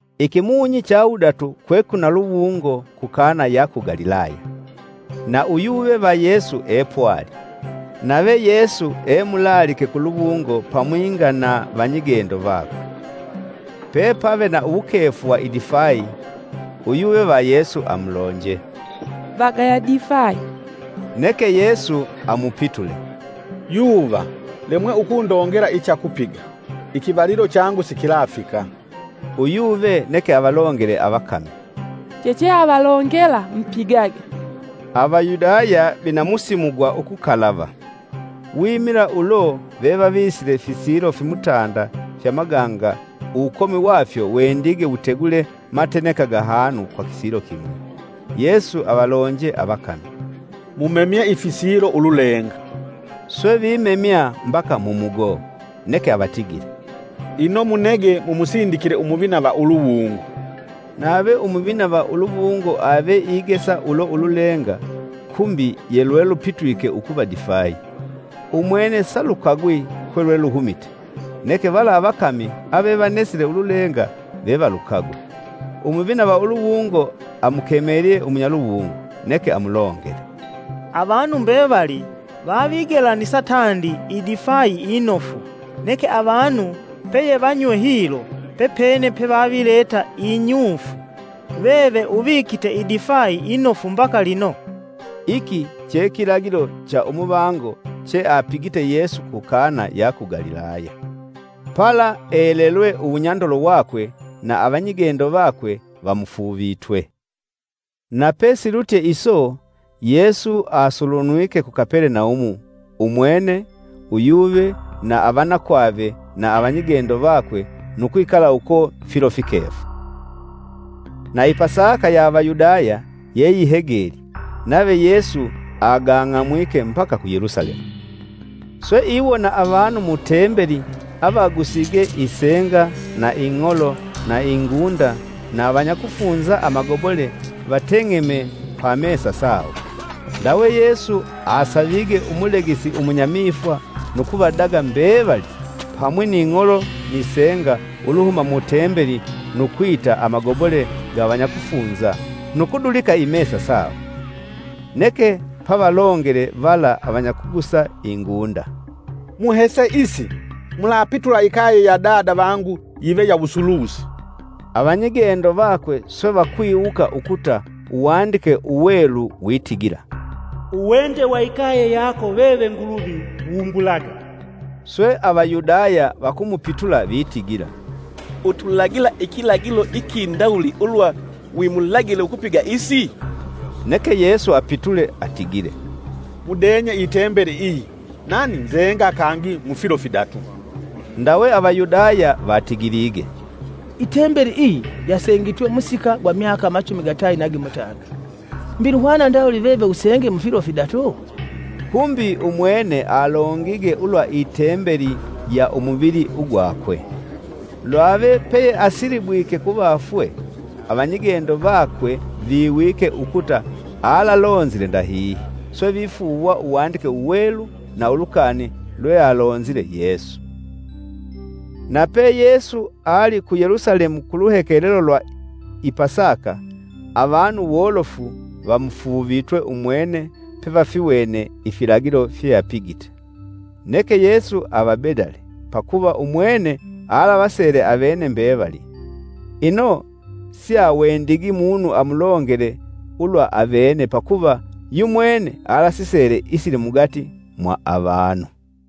Ikimunyi cha wudatu kwekwina luwungo ku Kana ya ku Galilaya. Na uyuve va Yesu epwali, Nave Yesu emulaalike kuluwungo pamwinga na vanyigendo vakwe. Pepave na uwukefu wa idifayi uyuve va Yesu amulonje, “Vagaya difayi!” Neke Yesu amupitule, “Yuva, lemwe ukundongela icha kupiga. Ikivalilo changu sikilafika.” Uyuve neke avalongele avakami, “Checheavalongela, mpigage.” Avayudaya vana musimu gwa ukukalava. Wimila ulo vevavisile fisilo fimutanda fya maganga uwukomi wafyo wendige wutegule mateneka gahanu kwa kisilo kimwi. Yesu avalonje avakami, “Mumemye ifisilo ululenga.” swe vimemya mbaka mumugoo, neke avatigile, “Ino munege mumusindikile umuvina va uluwungo.” Nave umuvina va uluwungo ave igesa ulo ululenga kumbi yelwelupitwike ukuva difayi. Umwene salukagwi kwelweluhumite, neke vala avakami avevanesile ululenga vevalukagwe. Umuvina va uluwungo amukemelye umunyaluwungo, neke amulongele, “Avanu mbevali vavigelanisa tandi idifayi inofu, neke avanu peyevanywe hilo, pepene pevavileta inyufu. Veve uvikite idifai inofu mbaka lino!” Iki che kilagilo cha umuvango cheapigite Yesu ku Kana ya ku Galilaya, pala elelwe uwunyandolo wakwe na avanyigendo vakwe vamufuuvitwe. Nape silutye iso Yesu asulunwike ku Kapelenaumu umwene, uyuve, na avanakwave na avanyigendo vakwe nu kwikala uko filo fikefu. Na i Pasaka ya Avayudaya yeyihegelye, nave Yesu agang'amwike mbaka ku Yelusalemu. Swe iwona avanu mu tembeli avagusige isenga na ing'olo na ingunda na avanyakufunza amagobole vateng'eme pa mesa sawo. Ndawe Yesu asaavige umulegesi umunyamifwa nu kuvadaga mbevali pamwi ni ng'olo ni senga, uluhuma mu Tembeli nu kwita amagobole ga avanyakufunza nu kudulika imesa sawo. Neke pavalongele vala avanyakugusa ingunda, “Muhese isi. Mulapitula ikaye ya Dada vangu yive ya wusulusi!” Avanyigendo vakwe swe vakwiwuka ukuta Uwandike Uwelu witigila, “Uwende wa ikaye yako veve Nguluvi wumbulaga.” Swe Avayudaya vakumupitula vitigila, “Utulagila ikilagilo ikindawuli ulwa wimulagile ukupiga isi?” Neke Yesu apitule atigile, “Mudenye i tembeli iyi, nani nzenga kangi mufilo fidatu.” Ndawe Avayudaya vatigilige, “I tembeli iyi yasengitwe musika gwa myaka machumi gatayi na gimutanda. Mbi luhwana ndawuli veve usenge mufilo fidatu?” Kumbi umwene alongige ulwa i tembeli ya umuvili ugwakwe. Lwave peyeasilibwike kuvafwe, avanyigendo vakwe viwike ukuta alalonzile ndahihi, swe vifuuwa Uwandike Uwelu na ulukani lwealonzile Yesu. Nape Yesu ali ku Yelusalemu ku luhekelelo lwa i Pasaka, avanu wolofu vamufuuvitwe umwene pevafiwene ifilagilo fyeapigite. Neke Yesu avabedale, pakuva umwene alavasele avene mbevali. Ino siawendigi munu amulongele ulwa avene, pakuva yumwene alasisele isili mugati mwa avanu.